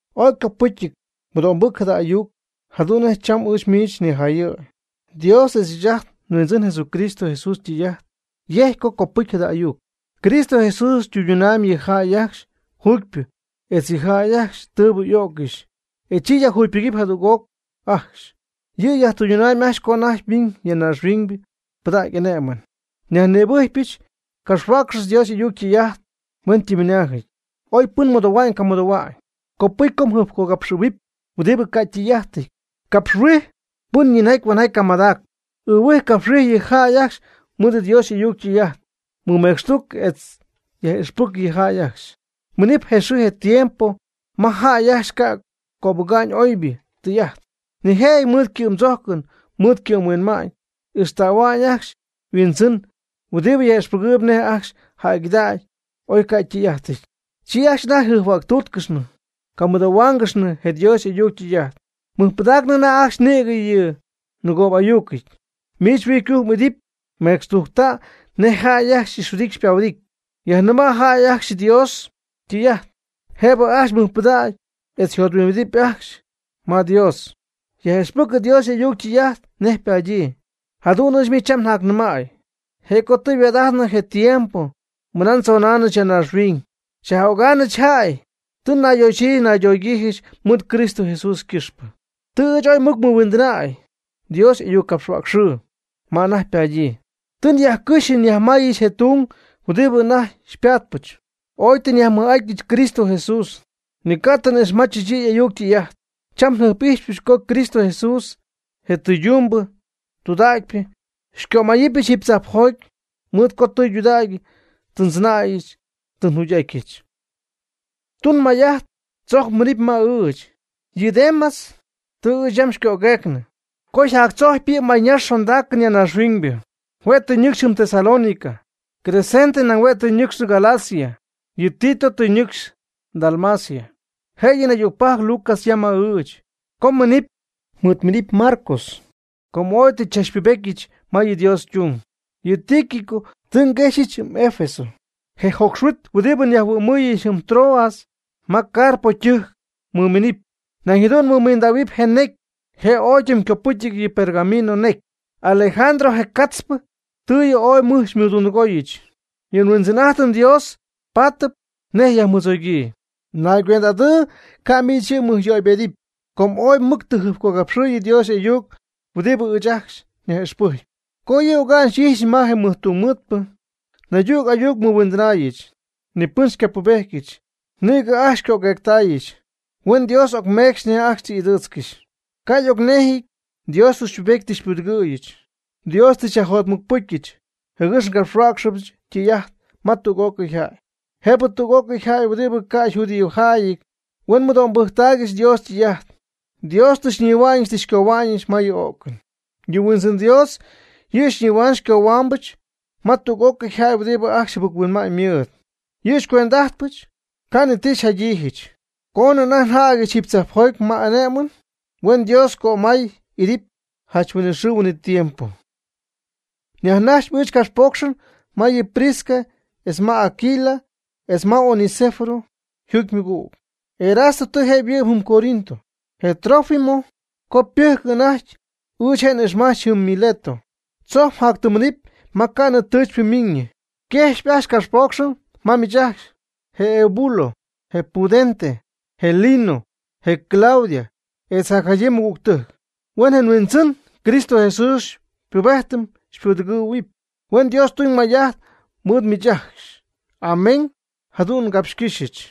Ooy ycopɨcyɨty mɨdo'mbɨc jada ayuc jadu'n nej cham ɨɨch miich nijayɨ̈y. Dios etz ɨɨch ajt nHuindzɨn Cristo Jesús tɨy'ajt yejc co copɨcy jada ayuc. Cristo Jesús ytɨydunamyb yɨ jäy ajcxy juugypɨ etz yɨ jäy ajcxy tɨɨbɨ y'o'ccɨxy, e chi yajjugypɨgɨpy jadüg'oc ajcxy. Yɨ' yajtɨydunamb ajcxy co anajty ymiñ ya naaxhuiñ pɨdäga'ñ y'ane'mɨn. Nyajnïbɨjcpy mgapxhuäcxɨp Dios y'ayuc ytɨy'ajt hueñytimymɨnaajɨty, oy pɨn mɨdoohua'ñ o camɨdoohua'ñ. Copɨcy co mjɨjpcogapxɨ̈huɨpy huɨdibɨ ca' ytɨy'ajtɨty, capxhuij pɨn yinjaty huenjaty camadacp, ɨɨhuij capxhuij yɨ jäy ajcxy mɨɨd Dios y'ayuc ytɨy'ajt. Mɨmecxtuc etz yaj'ixpɨc yɨ jäy ajcxy. Minɨp je xɨɨ je tiempo ma jäy ajcxy ca' cöbɨga'nɨ oybɨ tɨy'ajt. Nijëjɨty mɨɨd ycɨ'mdzojcɨn mɨɨd ycɨ'm-huinma'ñ ixtähuɨp ajcxy yhuindzɨn huɨdibɨ yaj'ixpɨgɨɨb nej ajcxy jäygɨdägy, oy ca' ytɨy'ajtɨty. Chi ajcxy anajty jɨjphuäctúutcɨxnɨ camɨdoohuáangɨxnɨ je Dios y'ayuc ytɨy'ajt. Mɨjpɨdaacnɨ anajty ajcxy nïgɨ yɨ nɨgoobɨ'ayucɨty. Miich huijy ycujc m'idɨpy. Mecxtujcta' nej jäy ajcxy xy'ixhuɨdity xypahuɨdity. Yajnɨma' jäy ajcxy Dios ytɨy'ajt, jëb ajcxy mɨjpɨdägɨpy etz jothuimbidɨpy ajcxy Dios. Yaj'ixpɨc Dios y'ayuc ytɨy'ajt nej ypadyii. Jadu'n miich cham njacnɨmäy, je' co tɨ yhuaad'ajtnɨ je tiempo mɨnaa ndzonaanɨch ya naaxhuiñ xyaj'ögaamɨch jäy, tɨ nayxoxyiijɨch naydogyiijɨch mɨɨd Cristo Jesús ycɨxpɨ. Tɨ ɨɨch ooy mɨc nmɨhuindɨnäy Dios y'ayuccapxhuäcxɨɨ ma anajty ypadyii. Tɨ nyajcɨxy nyajmayɨch je tung huɨdibɨ anajty xypatpɨch. Ooy tɨ nyajmɨj'atyɨch Cristo Jesús, ni ca' tɨ n'ixmajchɨch yɨ' y'ayuc ytɨy'ajt. Cham njɨjp'ijxypɨch co Cristo Jesús je tɨydumbɨ tudägypɨ xycömayɨpyɨch jiiby tzajpjoty, mɨɨd co tɨydudägy tɨ ndzɨnäyɨch tɨ njugy'atyɨch. Tun may'ajt tzojc yminɨpy ma ɨɨch. Yɨ Demas tɨ ɨɨch yam xycögueecnɨ co yjactzojcpy yɨ mayñax xondaacɨn ya naaxhuiñ. Hue' tɨ ñɨcxy jɨm Tesalónica. Crescente nañ hue' tɨ ñɨcxnɨ Galacia. Yɨ Tito tɨ ñɨcxy Dalmacia. Jëyɨ naydügpajc Lucas yam mɨɨd ɨɨch. Co mminɨpy, mɨɨdminɨpy Marcos, com ooy tɨ xychachpubetyɨch ma Dios ytung. Yɨ Tíquico tɨ nguexyɨch jɨm Efeso. Je jocxhuit huɨdibɨ nyajhuɨ'mɨɨyɨch jɨm Troas ma Carpo ytɨjc mɨminɨpy. Nañ jadu'n mɨmindähuɨpy je necy. Je' ooy ytimycopɨcyɨty yɨ pergamino necy. Alejandro je ca'tzpɨ tɨ yɨ' ooy mɨj xymɨdundɨgooyɨch. Yɨ nhuindzɨn'ajtɨm Dios paatɨp nej yajmɨdzogyii. Naygüend'adɨɨ ca' miich yɨ' mmɨjyöybedɨpy, com ooy mɨc tɨ jɨjpcogapxɨ̈y Dios y'ayuc huɨdibɨ ɨɨch ajcxy nyaj'ixpɨjcpy. Co yɨ' oga'n xyxɨ̈yɨch ma je mɨj tungmɨɨdpɨ, naydüg ayuc nmɨhuindɨnaayɨch. Nipɨn xycapubejtyɨch, nïgɨ ajcxy xycögueectaayɨch. Huen Dios ocmeecxy nej ajcxy tɨ y'ɨdɨɨtzcɨxy. Ca' y'ocnejɨty Dios tɨ xypubetyɨch tɨ xypudɨgɨ̈yɨch. Dios tɨ xyyajjotmɨcpɨcyɨch, jɨgɨx ngapxhuäcxtähuɨbɨch ytɨy'ajt ma tüg'ócɨy jäy. Jëb tüg'ócɨy jäy huɨdibɨ ca' yjudiojäyɨty huen mɨdo'mbɨjctaaygɨxy Dios ytɨy'ajt. Dios tɨ xyñihua'ñɨch tɨ xycohua'ñɨch ma yɨ o'cɨn. Yɨ Huindzɨn Dios yɨ' xyñihua'ñ xycohuá'ñɨbɨch ma tüg'ócɨy jäy huɨdibɨ ajcxy jɨbɨc-huinma'ñ mɨɨd. Yɨ'xycuend'adɨpɨch, ca' ni ti xyjadɨpyɨch, coonɨ anajty njädyɨch jiiby tzajpjoty ma y'ane'my. ¡Huen Dios cömay idɨpy janch huinɨxɨɨ huinɨtiempo! Yajnax ɨɨch ngapxpoocxɨn ma yɨ Prisca etz ma Aquila etz ma Onesífero yjuugy ymɨgüg. Erasto tɨ je' yhuɨ'my jɨm Corinto. Je Trófimo com pɨjcɨp anajty, ɨɨch je' n'ixmajch jɨm Mileto. Tzojc mjatyminɨpy ma ca'nɨ tɨɨchpy ymiinɨ. Yquejxyp ajcxy capxpoocxɨn ma miich, je Eubulo, je Pudente, je Lino, je Claudia etz jacjadyii mɨgügtɨjc. Huen je Huindzɨn Cristo Jesús xypubedɨpy xypudɨgɨ̈huɨpy. Huen Dios tuñ may'ajt mɨɨd miich ajcxy. Amén. Jadu'n ngapxcɨ́xyɨch.